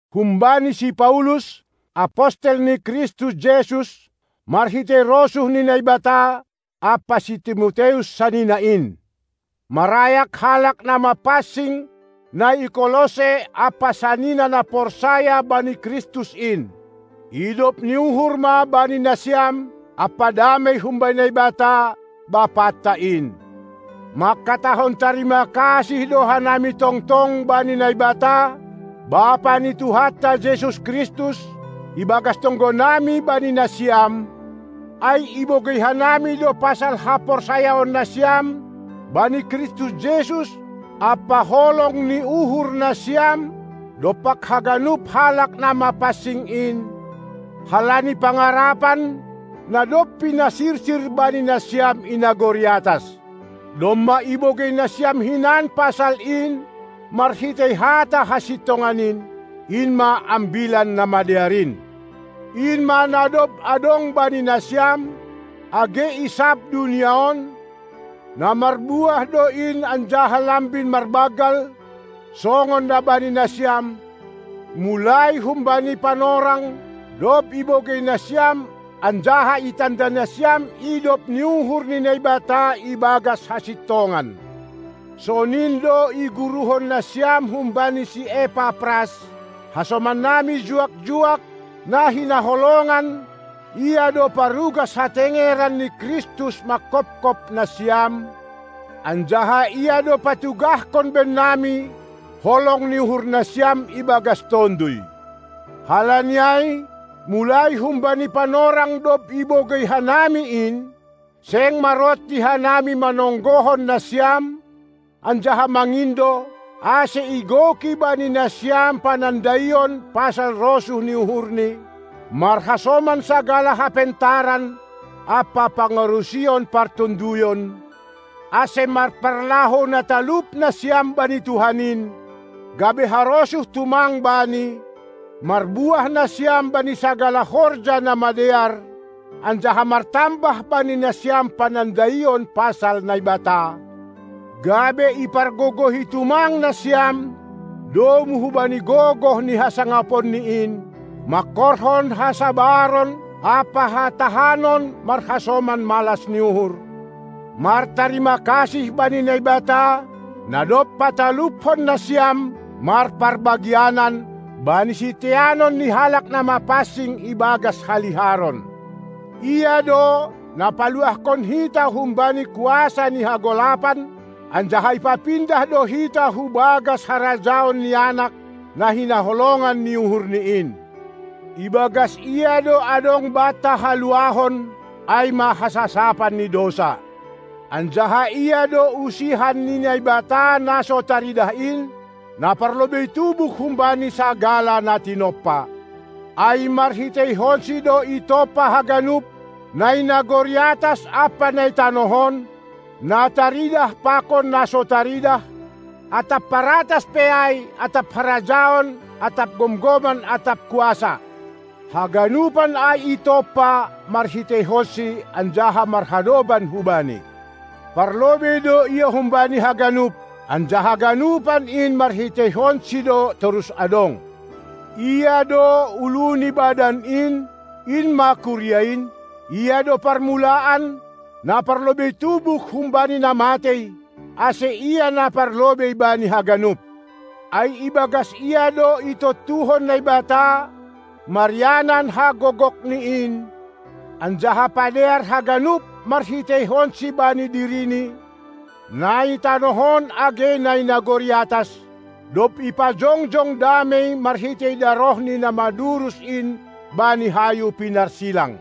Humbani si Paulus, apostel ni Kristus Jesus Marhitei rosuh ni Naibata, ampa si Timoteus sanina in, marayak halak na mapansing na i Kolosse ampa sanina na porsaya bani Kristus in: Idop ni uhur ma bani nasiam ampa damei humbani Naibata, Bapanta in. Mangkatahon tarima kasih do hanami tongtong bani Naibata, Bapa ni Tuhanta Jesus Kristus, ibagas tonggonami bani nasiam, ai ibogei hanami do pasal haporsayaon nasiam bani Kristus Jesus ampa holong ni uhur nasiam dompak haganup halak na mapansing in, halani pangarapan, na dob pinasirsir bani nasiam i nagori atas. Domma ibogei nasiam hinan pasal in marhitei hata hasintongan in, in ma Ambilan Namadear in. In ma na dob adong bani nasiam, age i sab dunia on; na marbuah do in anjaha lambin marbanggal, songon na bani nasiam, mulai humbani panorang, dob ibogei nasiam anjaha itanda nasiam idop ni uhur ni Naibata ibagas hasintongan. Sonin do iguruhon nasiam humbani si Epapras, hasomannami juak-juak, na hinaholongan, ia do parugas hatengeran ni Kristus manghopkop nasiam, anjaha ia do patugahkon bannami holong ni uhur nasiam ibagas Tonduy. Halani ai, mulai humbani panorang dob ibogei hanami in, seng maronti hanami manonggohon nasiam anjaha mangindo, ase igoki bani nasiam panandaion pasal rosuh ni uhurni, marhasoman sagala hapentaran ampa pangarusion partonduyon, ase marparlahou na talup nasiam bani Tuhan in, gabe harosuh tumang Bani, marbuah nasiam bani sagala horja na madear, anjaha martambah bani nasiam panandaion pasal Naibata, gabe ipargogohi tumang nasiam domu hubani gogoh ni hasangaponni in, mangkorhon hasabaron ampa hatahanon marhasoman malas ni uhur; martarima kasih bani Naibata, na dob pataluphon nasiam marparbagianan bani siteanon ni halak na mapansing ibagas haliharon. Ia do, na paluahkon hita humbani kuasa ni hagolapan, anjaha ipapindah do hita hu bagas harajaon ni Anak, na hinaholongan ni uhurNi in. Ibagas Ia do adong banta haluahon, ai ma hasasapan ni dousa. Anjaha Ia do usihan ni Naibata na so taridah in, na parlobei tubuh humbani sagala na tinompa, ai marhiteihonsi do itompa haganup, na i nagori atas ampa na i tanoh on, na taridah pakon na so taridah, atap paratas pe ai atap harajaon atap gomgoman atap kuasa. Haganupan ai itompa marhiteihonsi anjaha marhadoban hu-Bani. Parlobei do Ia humbani haganup, anjaha ganupan in marhiteihonSi do torus adong. Ia do ulu ni badan in, in ma kuria in. Ia do parmulaan, na parlobei tubuh humbani na matei, ase Ia na parlobei bani haganup. Ai ibagas Ia do itontuhon Naibata, marianan hagogokNi in, anjaha padear haganup marhiteihonSi bani diriNi, na i tanoh on age na i nagori atas, dob ipajongjong damei marhitei darohni na madurus in bani hayu pinarsilang.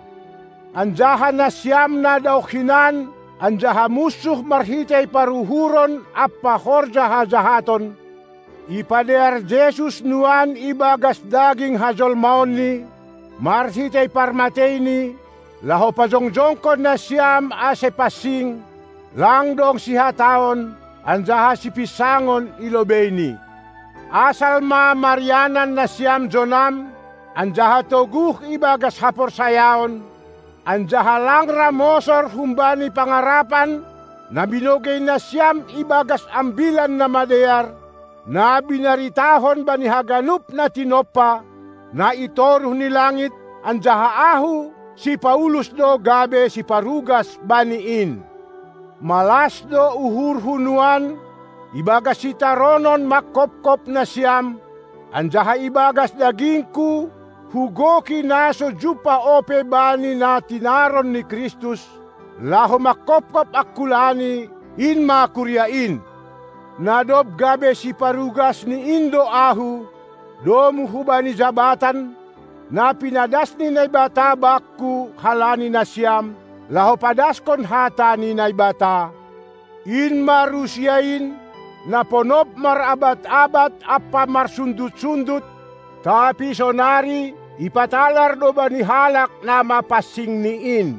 Anjaha nasiam na daoh hinan anjaha munsuh marhitei paruhuron ampa horja hajahaton, ipadear Jesus nuan ibagas daging hajolmaonNi, marhitei parmateiNi, laho pajongjongkon nasiam ase pansing, lang dong sihataon anjaha sipinsangon i lobeiNi. Asal ma marianan nasiam jonam, anjaha toguh ibagas haporsayaon, anjaha lang ra mosor humbani pangarapan na binogei nasiam ibagas Ambilan Namadear, na binaritahon bani haganup na tinompa, na itoruh ni langit, anjaha ahu, si Paulus do gabe siparugas bani in. Malas do uhurhu nuan ibagas sitaronon manghophop nasiam, anjaha ibagas dagingku hugoki na so jumpah ope bani na tinaron ni Kristus, laho manghophop angkulani, in ma kuria in. Na dob gabe siparugas ni in do ahu, domu hubani jabatan, na pinadas ni Naibata bakku halani nasiam, laho padaskon hata ni Naibata, in ma rusia in, na ponop marabad-abad ampa marsundut-sundut; tapi sonari ipatalar do bani halak na mapansingni in.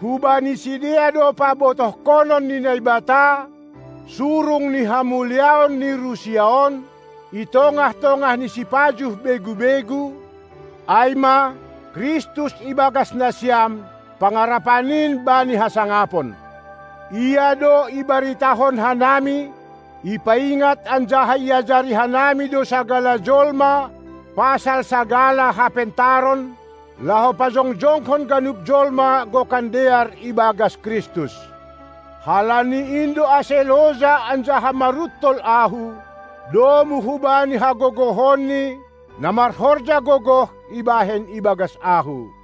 Hubani sidea do pabotohkonon ni Naibata surung ni hamuliaon ni rusia on, i tongah-tongah ni sipajuh begu-begu, ai ma: Kristus ibagas nasiam, pangarapan in bani hasangapon. Ia do ibaritahon hanami; ipaingat anjaha iajari hanami do sagala jolma pasal sagala hapentaron, laho pajongjongkon ganup jolma gokan dear ibagas Kristus. Halani in do ase loja anjaha maruntol ahu, domu hubani hagogohonNi na marhorja gogoh ibahen ibagas ahu.